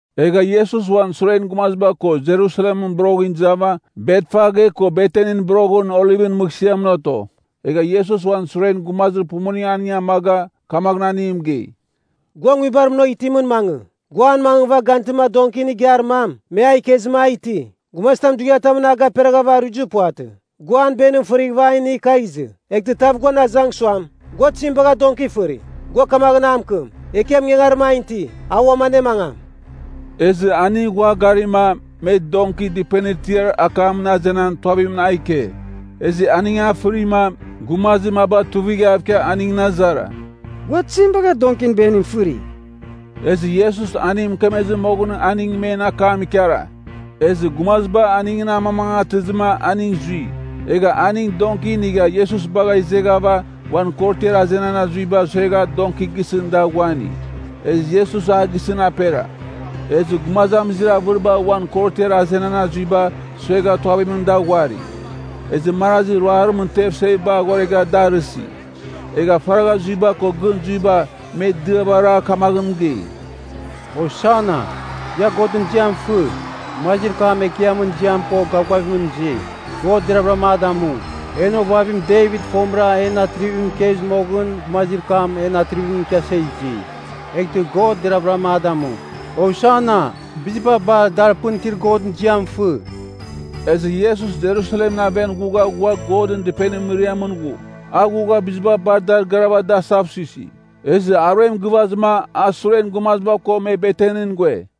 Egha Iesus uan suren gumaziba ko Jerusalemɨn boroghɨn izava Betfage ko Betanin boroghɨn Olivɨn mɨghsɨamɨn oto. Egha Iesus uan suren gumazir pumuning aning amaga, kamaghɨn aning mɨgei, “Gua nguibar munagh itimɨn mangɨ, gua an mangɨva gantɨma donkin igiar mam, me a ikezɨma, a iti. Gumazitam dughiatamɨn a gaperaghava aruizir puvatɨ. Gua an benim fɨrighɨva a inigh kagh izɨ. Eghtɨ tav guan azang suam, ‘Gua tizim bagha donki fɨri?’ gua kamaghɨn a mɨkɨm, ‘Ekiam ingangarim an iti. A uam anemangam.’” Ezɨ aning ghua garima, me donki dɨpenir tiar akamɨn azenan tuavimɨn a ike. Ezɨ aning a fɨrima, gumazir maba tuivighav ikia aningɨn azara, “Gua tizim bagha donkin benim fɨri?” Ezɨ Iesus aning mɨkemezɨ moghon aning men akam ikara. Ezɨ gumaziba aningɨn amamangatɨzɨma aning zui. Egha aning donki inigha Iesus bagha izeghava uan korotiar azenan azuiba suegha donki gisɨn da ghuani. Ezɨ Iesus a gisɨn apera. Ezɨ gumazamizir avɨriba uan korotiar azenan azuiba suegha tuavimɨn da ghuari. Ezɨ marazi ruarimɨn tev seviba aghoregha da arɨsi. Egha faragha zuiba ko gɨn zuiba me diava ara kamaghɨn mɨgei, “Hosana! Ia Godɨn ziam fɨ! Gumazir kam Ekiamɨn ziam ko gavgavimɨn izi. God deravɨra a damu.” “En ovavim Devit fomɨra en atrivimɨn ikezɨ moghɨn gumazir kam en atrivimɨn ikiasa izi. Eghtɨ God deravɨra a damu. Hosana! Biziba bar dar pɨn itir Godɨn ziam fɨ!” Ezɨ Iesus Jerusalemɨn aven ghugha ghua Godɨn Dɨpenir mɨriamɨn ghu. A ghugha biziba dar garava da asavsuisi. Ezɨ aruem gɨvazɨ a suren gumaziba ko me Betanin ghue.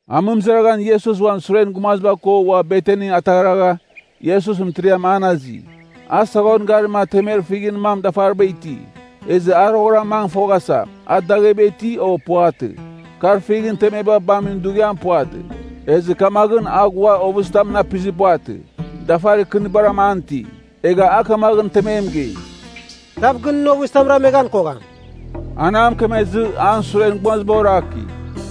Amɨmɨzaraghan Iesus uan suren gumaziba ko ua Betani ataghragha, Iesus mɨtiriam an azi. A saghon garima temer fighɨn mam dafaribara iti. Ezɨ a roghɨra mangɨ foghasa a dagheba iti, o puvatɨ. Kar fighɨn temeba bamin dughiam puvatɨ. Ezɨ kamaghɨn a ghua ovɨzitamɨn apizir puvatɨ, dafarir kɨnbaram an iti. Egha a kamaghɨn temem mɨgei, “Tav gɨn nɨn ovɨzitam rameghan kogham.” An a mɨkemezɨ, an suren gumaziba oraki.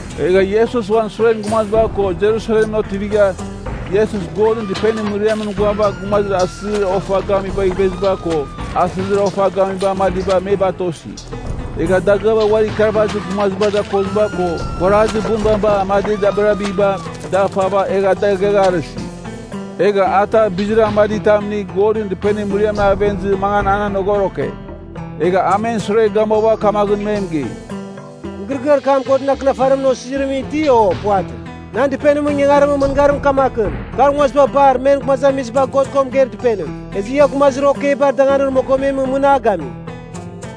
Egha Iesus uan suren gumaziba ko Jerusalemɨn otivigha, Iesus Godɨn Dɨpenir mɨriamɨn ghuava gumazir asɨzir ofa gamibagh iveziba ko asɨzir ofa gamiba amadiba me batosi. Egha dagɨaba uari ikarvazir gumazibar dakoziba ko kuarazir bunbaba amadibar dabirabiba, da fava egha da ighagharɨsi. Egha a tav bizir amaditam inigh Godɨn Dɨpenir mɨriamɨn aven izɨ mangan an anogoroke. Egha a men sure gamuava kamaghɨn me mɨgei, “Mɨgɨrɨgɨar kam Godɨn Akɨnafarimɨn osizirimɨn iti, o puvatɨ? ‘Nan dɨpenimɨn ingangarimɨn mɨngarim kamakɨn, kar nguaziba bar men Gumazamiziba God ko Mɨgeir Dɨpenim.’ Ezɨ ia gumazir okeibar danganir mogomemɨn mɨn a gami.”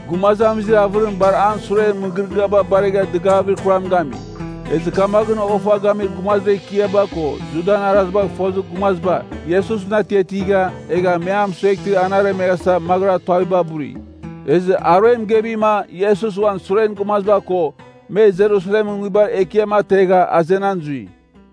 Gumazamizir avɨrim bar an suren mɨgɨrɨgɨaba baregha dɨgavir kuram gami. Ezɨ kamaghɨn ofa gamir gumazir ekiaba ko Judan arazibagh fozir gumaziba Iesusɨn atiatigha, egh me a mɨsueghtɨ an aremeghasa maghɨra tuaviba buri. Ezɨ aruem gevima Iesus uan suren gumaziba ko me Jerusalemɨn nguibar ekiam ategha azenan zui.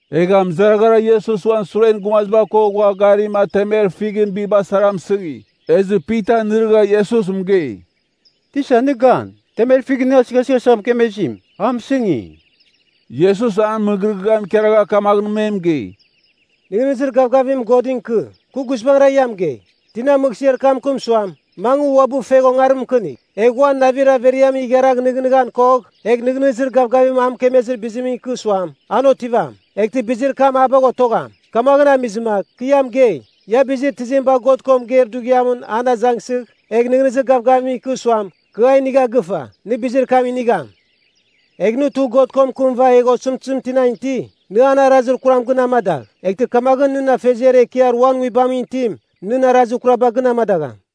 Egha mɨzaraghara Iesus uan suren gumaziba ko ghua garima temer fighɨn biba sara mɨsɨngi. Ezɨ Pita nɨrɨgha Iesus mɨgei, “Tisa nɨ gan, temer fighɨn nɨ asɨghasɨghasa mɨkemezim, a mɨsɨngi!” Iesus an mɨgɨrɨgɨam ikaragha kamaghɨn me mɨgei, “Nɨghnɨzir gavgavim Godɨn ikɨ. Kɨ guizbangɨra ia mɨgei, tina mɨghsɨar kam mɨkɨm suam, ‘Mangɨ uabɨ fegh ongarim mɨkɨnigh,’ egh uan navir averiamɨn igharagh nɨghnɨghan kogh, egh nɨghnɨzir gavgavim a mɨkemezir bizimɨn ikɨ suam, ‘An otivam,’ eghtɨ bizir kam a bagh otogham. Kamaghɨn amizɨma kɨ ia mɨgei, ia bizir tizim bagh God ko mɨgeir dughiam an azangsɨgh, egh nɨghnɨzir gavgavim ikɨ suam, ‘Kɨ a inigha gɨfa,’ nɨ bizir kam inigham. Egh nɨ tugh God ko mɨkɨmɨva egh osɨmtɨzim tinan iti, nɨ an arazir kuram gɨn amadagh, eghtɨ kamaghɨn nɨn Afeziar Ekiar uan nguibamɨn itim nɨn arazir kuraba gɨn amadagham.”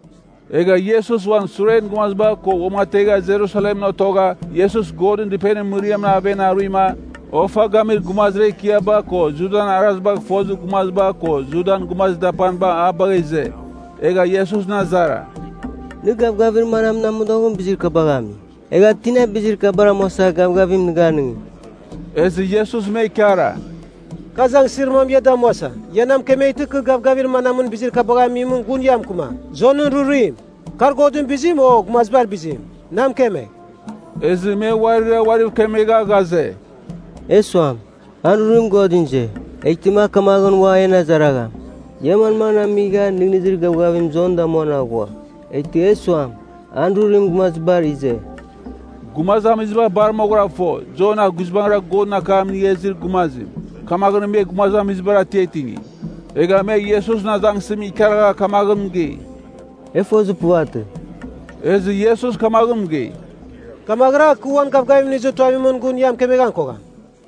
Egha Iesus uan suren gumaziba ko uamategha Jerusalemɨn otogha Iesus Godɨn Dɨpenimɨn mɨriamɨn aven aruima, ofa gamir gumazir ekiaba ko Judan arazibagh fozir gumaziba ko Judan gumazir dapaniba a bagha ize. Egha Iesusɨn azara, “Nɨ gavgavir manamɨn amodoghɨn bizir kabagh ami? Egha tina bizir kabar amuasa gavgavim nɨ ganɨngi?” Ezɨ Iesus me ikara, “Kɨ azangsɨzir mam ia damuasa ia na mɨkemeghtɨ kɨ gavgavir manamɨn bizir kabagha amimɨn gun ia mɨkɨmam. Jonɨn rurim—kar Godɨn bizim, o gumazibar bizim? Na mɨkemegh!” Ezɨ me uarira uariv kemegha ghaze, “E suam, ‘An rurim Godɨn ize,’ eghtɨma a kamaghɨn ua en azaragham, ‘Ia manmaghɨn amigha nɨghnɨzir gavgavim Jon damuan aghua?’ Eghtɨ e suam, ‘An rurim gumazibar ize’....” (Gumazamiziba bar moghɨra fo, Jon a guizbangɨra Godɨn akam inigha izir gumazim, kamaghɨn me gumazamizibar atiatingi.) Egha me Iesusɨn azangsɨzim ikaragha kamaghɨn mɨgei, “E fozir puvatɨ.” Ezɨ Iesus kamaghɨn mɨgei, “Kamaghɨra, kɨ uan gavgavim inizir tuavimɨn, gun ia mɨkemeghan kogham.”